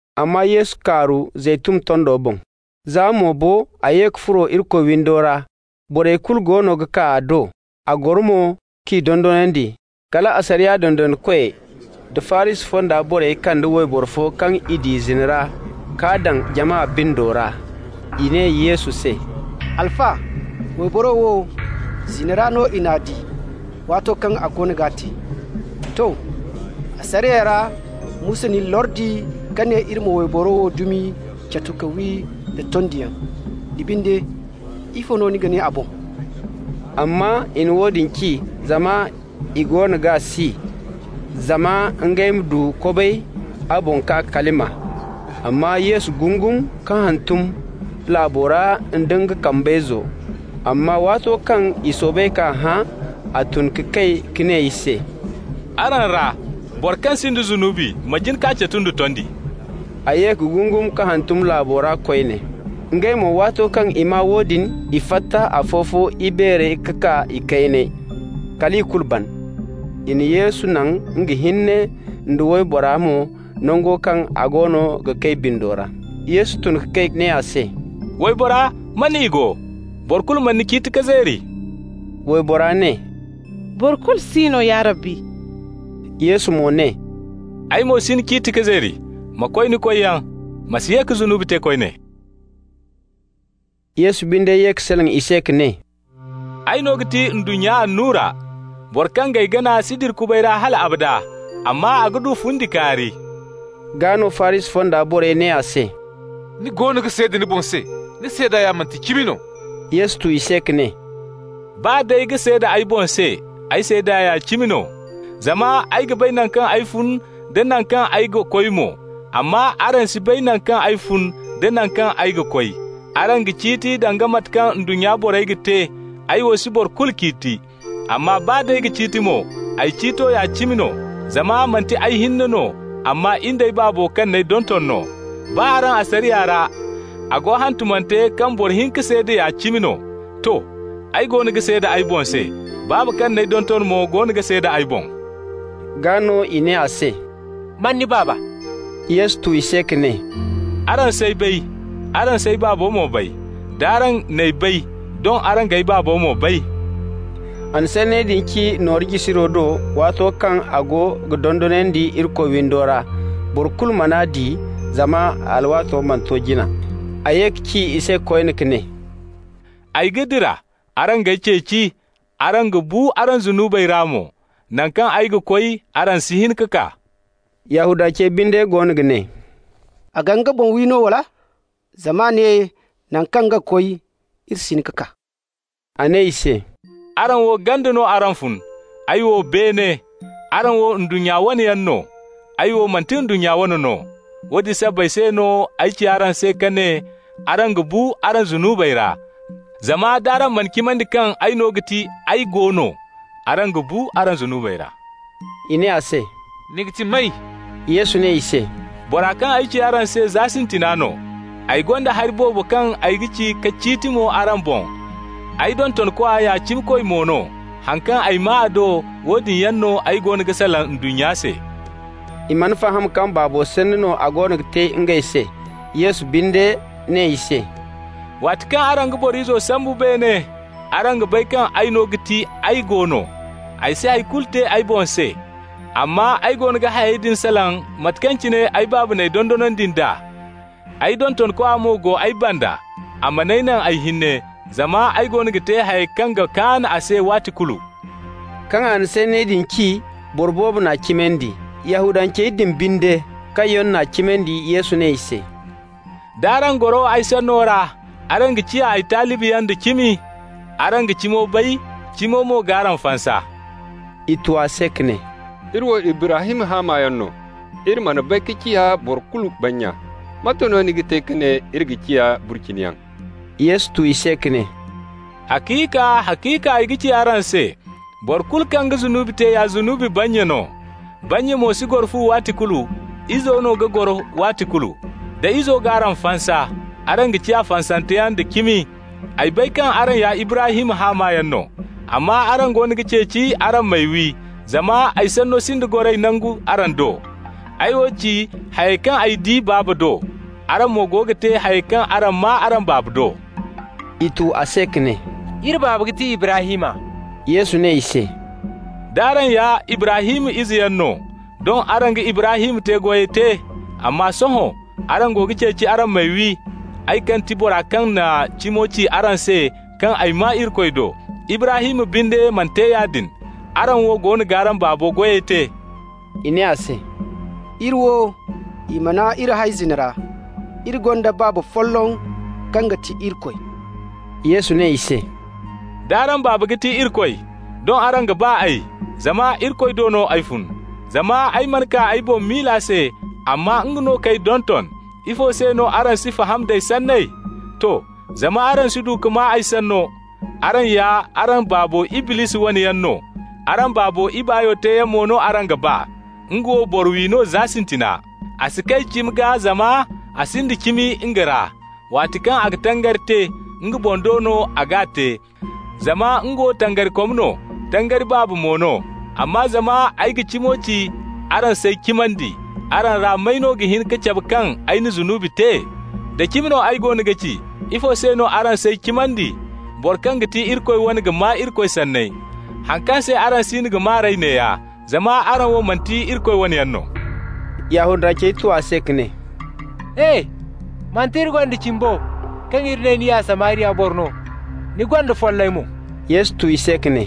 amma Yesu kaaru Zeytun tondo boŋ. Za mo bo a ye ka furo Irikoy windo ra. Borey kulu goono ga kaa a do, a goro mo k'i dondonandi. Kala asariya dondonandikoy da Farisi fonda borey kande wayboro fo kaŋ i di zina ra k'a daŋ jama bindo ra. I ne Yesu se: «Alfa, wayboro wo, zina ra no i n'a di waato kaŋ a goono g'a te. To. Asariya ra Musa n'iri lordi ka ne iri ma wayborey wo dumi catu ka wi da tondiyaŋ. Ni binde, ifo no ni ga ne a boŋ?» (Amma i na woodin ci zama i goono g'a si, zama ngey ma du kobay a boŋ k'a kalima.) Amma Yesu gungum ka hantum laabo ra nda nga kambayzo. Amma waato kaŋ i soobay k'a hã, a tun ka kay ka ne i se: «Araŋ ra boro kaŋ sinda zunubi ma jin k'a catu nda tondi.» A ye ka gungum ka hantum laabo ra koyne. Ngey mo, waato kaŋ i maa woodin, i fatta afo-fo, ibeerey ka kaa ikayney, kal ikulu ban. I na Yesu naŋ nga hinne nda waybora mo nango kaŋ a go ga kay bindo ra. Yesu tun ka kay ka ne a se: «Waybora, man i go? Boro kulu mana ni ciiti ka zeeri?» Waybora ne: «Boro kulu si no, ya Rabbi.» Yesu mo ne: «Ay mo si ni ciiti ka zeeri. Ma koy ni koyyaŋ. Ma si ye ka zunubi te koyne.» Yesu binde ye ka salaŋ i se ka ne: «Ay no ga ti ndunnya annura. Boro kaŋ g'ay gana si dira kubay ra hal abada, amma a ga du fundi kaari.» Gaa no, Farisi fonda borey ne a se: «Ni goono ga seeda ni boŋ se, ni seeda manti cimi no.» Yesu tu i se ka ne: «Baa d'ay ga seeda ay boŋ se, ay seeda ya cimi no, zama ay ga bay naŋ kaŋ ay fun da naŋ kaŋ ay ga koy mo. Amma araŋ si bay naŋ kaŋ ay fun da naŋ kaŋ ay ga koy. Araŋ ga ciiti danga mate kaŋ ndunnya borey ga te, ay wo si boro kulu ciiti. Amma baa d'ay ga ciiti mo, ay ciito ya cimi no, zama manti ay hinne no, amma in d'ay Baabo kaŋ n'ay donton no. Baa araŋ asariya ra a go hantumante kaŋ boro hinka seeda ya cimi no. To, ay goono ga seeda ay boŋ se, Baaba kaŋ n'ay donton mo goono ga seeda ay boŋ.» Gaa no i ne a se: «Man ni Baaba?» Yesu tu i se ka ne: «Araŋ s'ay bay, araŋ s'ay Baabo mo bay. D'araŋ n'ay bay, doŋ araŋ g'ay Baabo mo bay.» A na sanney din ci nooru jisiro do, waato kaŋ a go ga dondonandi Irikoy windo ra. Boro kulu man'a di, zama a alwaato mana to jina. A ye ka ci i se koyne ka ne: «Ay ga dira. Araŋ g'ay ceeci, araŋ ga bu araŋ zunubey ra mo. Naŋ kaŋ ay ga koy, araŋ si hin ka kaa.» Yahudancey binde goono ga ne: «A ga nga boŋ wi no, wala? Zama a ne naŋ kaŋ nga ga koy, iri si hin ka kaa.» A ne i se: «Araŋ wo ganda no araŋ fun, ay wo beene. Araŋ wo ndunnya wo wane yaŋ no. Ay wo manti ndunnya wo wane no. Woodin sabbay se no ay ci araŋ se ka ne araŋ ga bu araŋ zunubey ra. Zama d'araŋ mana cimandi kaŋ ay no ga ti AY GO NO, araŋ ga bu araŋ zunubey ra.» I ne a se: «Ni ga ti may?» Yesu ne i se: «Bora kaŋ ay ci araŋ se za sintina no. Ay gonda hari boobo kaŋ ay ga ci ka ciiti mo araŋ boŋ, ay dontonkwa ya cimikoy mo no. Haŋ kaŋ ay maa a do, woodin yaŋ no ay goono ga salaŋ ndunnya se.» I mana faham kaŋ Baabo sanni no a goono ga te ngey se. Yesu binde ne i se: «Waati kaŋ araŋ ga Boro Izo sambu beene, araŋ ga bay kaŋ ay no ga ti AY GO NO. Ay si hay kulu te ay boŋ se, amma ay goono ga hayey din salaŋ mate kaŋ cine ay Baaba n'ay dondonandi nd'a. Ay dontonkwa mo go ay banda, a man'ay naŋ ay hinne, zama ay goono ga te hayey kaŋ ga kaan a se waati kulu.» Kaŋ a na sanney din ci, boro boobo n'a cimandi. Yahudancey din binde kaŋ yaŋ n'a cimandi, Yesu ne i se: «D'araŋ goro ay sanno ra, araŋ ga ciya ay talibiyaŋ da cimi. Araŋ ga cimo bay, cimo mo g'araŋ fansa.» I tu a se ka ne: «Iri wo Ibrahim haamayaŋ no, iri mana bay ka ciya boro kulu bannya. Mate no ni ga te ka ne iri ga ciya burciniyaŋ?» Yesu tu i se ka ne: «Haciika, haciika ay ga ci araŋ se: boro kulu kaŋ ga zunubi te ya zunubi bannya no. Bannya mo si goro fu waati kulu, izo no ga goro waati kulu. Da Izo g'araŋ fansa, araŋ ga ciya fansanteyaŋ da cimi. Ay bay kaŋ araŋ ya Ibrahim haamayaŋ no. Amma araŋ goono ga ceeci araŋ m'ay wi, zama ay sanno sinda goray nangu araŋ do. Ay wo ci hayey kaŋ ay di Baaba do. Araŋ mo go ga te hayey kaŋ araŋ maa araŋ baaba do.» I tu a se ka ne: «Iri baaba ga ti Ibrahim.» Yesu ne i se: «D'araŋ ya Ibrahim izeyaŋ no, doŋ araŋ ga Ibrahim te-goyey te. Amma sohõ araŋ go ga ceeci araŋ m'ay wi, ay kaŋ ti bora kaŋ na cimo ci araŋ se kaŋ ay maa Irikoy do. Ibrahim binde mana te yaadin. Araŋ wo goono g'araŋ baabo goyey te.» I ne a se: «Iri wo, i mana iri hay zina ra. Iri gonda baaba folloŋ kaŋ ga ti Irikoy.» Yesu ne i se: «D'araŋ baaba ga ti Irikoy, doŋ araŋ ga ba ay, zama Irikoy do no ay fun. Zama ay mana kaa ay boŋ miila se, amma nga no k'ay donton. Ifo se no araŋ si faham nd'ay sanney? To, zama araŋ si du ka maa ay sanno. Araŋ ya araŋ baabo Iblisi wane yaŋ no, araŋ baabo ibaayo teeyaŋ mo no araŋ ga ba. Nga wo boro-wi no za sintina. A si kay cimi gaa, zama a sinda cimi nga ra. Waati kaŋ a ga tangari te, nga boŋ do no a g'a te, zama nga wo tangarikom no, tangari baaba mo no. Amma zama ay ga cimo ci, araŋ s'ay cimandi. Araŋ ra may no ga hin ka cabe kaŋ ay na zunubi te? Da cimi no ay goono ga ci, ifo se no araŋ s'ay cimandi? Boro kaŋ ga ti Irikoy wane ga maa Irikoy sanney. Haŋ kaŋ se araŋ siino ga maa r'ey neeya: zama araŋ wo manti Irikoy wane yaŋ no.» Yahudancey tu a se ka ne: «E! Manti iri gonda cimi bo kaŋ iri ne ni ya Samariya boro no, ni gonda follay mo?» Yesu tu i se ka ne: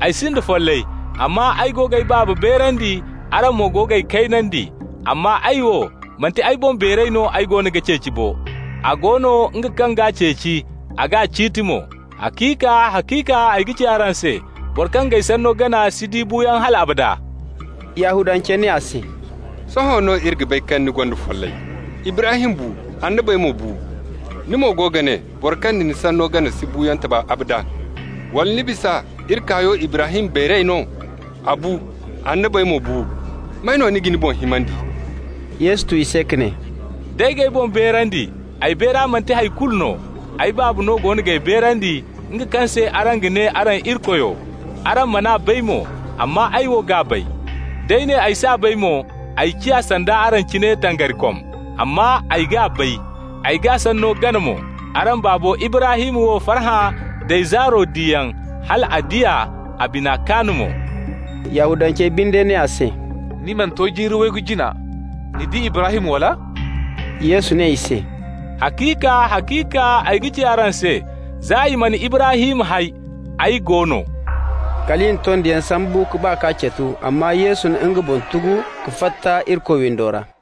«Ay sinda follay, amma ay go g'ay Baaba beerandi, araŋ mo go g'ay kaynandi. Amma ay wo, manti ay boŋ beeray no ay goono ga ceeci bo. A go no nga kaŋ g'a ceeci, a ga ciiti mo. Haciika, haciika ay ga ci araŋ se: boro kaŋ g'ay sanno gana si di buuyaŋ hal abada.» Yahudancey ne a se: «Sohõ no iri bay kaŋ ni gonda follay. Ibrahim bu, annabey mo bu. Ni mo go ga ne boro kaŋ ga ni sanno gana si buuyaŋ taba abada. Wala ni bisa iri kaayo Ibrahim beeray no? A bu, annabey mo bu. May no ni ga ni boŋ himandi?» Yesu tu i se ka ne: «D'ay g'ay boŋ beerandi, ay beera manti hay kulu no. Ay Baaba no goono g'ay beerandi, nga kaŋ se araŋ ga ne araŋ Irikoyo. Araŋ man'a bay mo, amma ay wo g'a bay. D'ay ne ay s'a bay, ay ciya sanda araŋ cine, tangarikom. Amma ay g'a bay, ay g'a sanno gana mo. Araŋ baabo Ibrahim wo farhã d'ay zaaro diyaŋ. Hal a di a, a bina kaan mo.» Yahudancey binde ne a se: «Ni mana to jiiri waygu jina! Ni di Ibrahim, wala?» Yesu ne i se: «Haciika, haciika ay ga ci araŋ se: za i mana Ibrahim hay, AY GO NO.» Kal i na tondiyaŋ sambu ka ba k'a catu, amma Yesu na nga boŋ tugu ka fatta Irikoy windo ra.